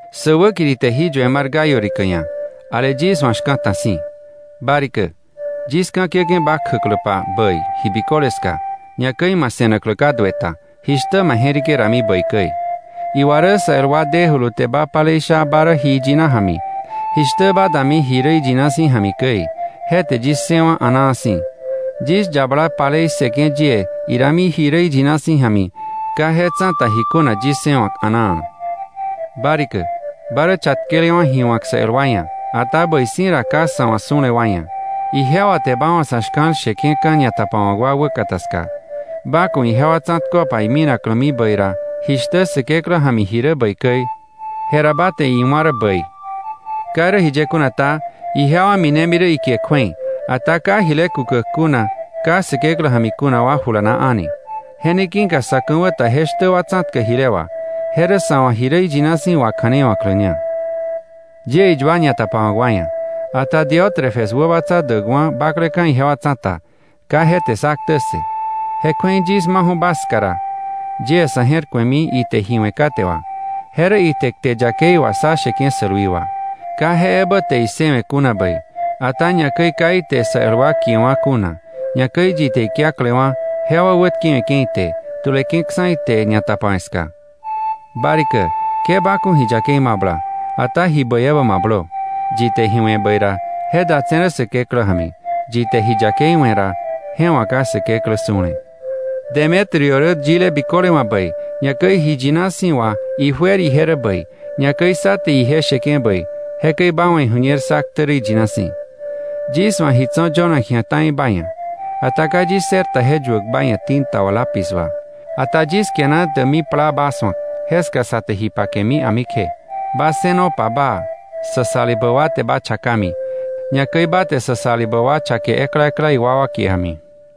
Sä wäkiri te jí yue mar Gayo rikä ia̱, ale yis wa̱ shka̱ta si̱. Ba rikä, yis ka̱ kiäke̱ ba kjäkläpa bäi ji biköle ska, ñakäi ma se̱naklä ka dueta, jishtä ma je̱rike dami bäi käi. Iwa rä sä el wa dejulu te ba palei sha ba rä ji iyina ja̱mi, jishtä ba dami ji rä iyina si̱ ja̱mi käi. Je te yis ssëwa̱ a̱naa si̱. Yis yabala palei ssëke̱ yie idami ji rä iyina si̱ ja̱mi, ka je tsa̱ta ji kuna yis ssëwa̱k a̱naa. Ba rikä, ba rä chatkelewa̱ ji wa̱k sa el wa ia̱, ata bäi si̱ ra ka sa̱ wa̱ su̱le wa ia̱. Ijewa te ba wa̱ sa̱ shka̱l sheke̱ka̱ ñatapawa̱ wa wäkata ska. Ba ku̱ ijewa tsa̱tköpa iminaklämi bäi ra, jishtä Säkeklä ja̱mi ji rä bäi käi, je ra ba te iwá̱ rä bäi. Ka irä jiye kuna ta, ije wa minemi rä ikie kju̱ei, ka Säkeklä ja̱mi kuna wa jile kukäk kuna a̱ni. Je ne ki̱ka sa̱ ka̱wä ta je shtä wa tsa̱tkäk jile wà, je rä sa wa̱ ji rä iyina si̱ wakja̱nei wa̱kläña. Yie iyua ñatapawa̱k wa ia̱, ata Diótrefes wäbatsa däkwa̱ bakleka̱ ijewa tsa̱ta, ka je te sá ktä ssë. Je kju̱ei yis maju̱ ba ska ra, yie sa̱ je̱r ku̱emi ite ji we̱ kate wà, je rä ite kte yakei wà sá sheke̱ sälwi wà. Ka je ebä te issëwe̱ kuna bäi, ata ñakäi ka ite sa el wa kiewa̱ kuna, ñakäi yi te ikiaklewa̱ jewa wätkewe̱ke̱ ite, tu̱leke̱ksa̱ ite ñatapawe̱ ska. Ba rikä, ke ba ku̱ ji yakei mabla, ata ji bäi ebä mablö. Yi te ji we̱ bäi ra, je datse̱ rä Säkeklä ja̱mi. Yi te ji yakei we̱ ra, je wa̱ ka Säkeklä su̱le. Demetrio rä yile biköle wa̱ bäi, ñakäi ji yina si̱ wà ijuer ije rä bäi, ñakäi sá te ije sheke̱ bäi, jekäi ba wa̱ iju̱ñer sá ktä rä iyina si̱. Yis wa̱ ji tso̱ yönak ji̱a ta̱i ba ia̱, ata ka yis ssër ta je yuäk ba ia̱ tinta wà lápiz wà. Ata yis kiana däkmi plaa ba su̱ak, jeska sa te ji pakemi a̱mi kje. Ba ssënopa baa. Sa salibä wa te ba chakami, ñakäi ba te sa salibä wa chake ekla ekla iwakwa kie ja̱mi.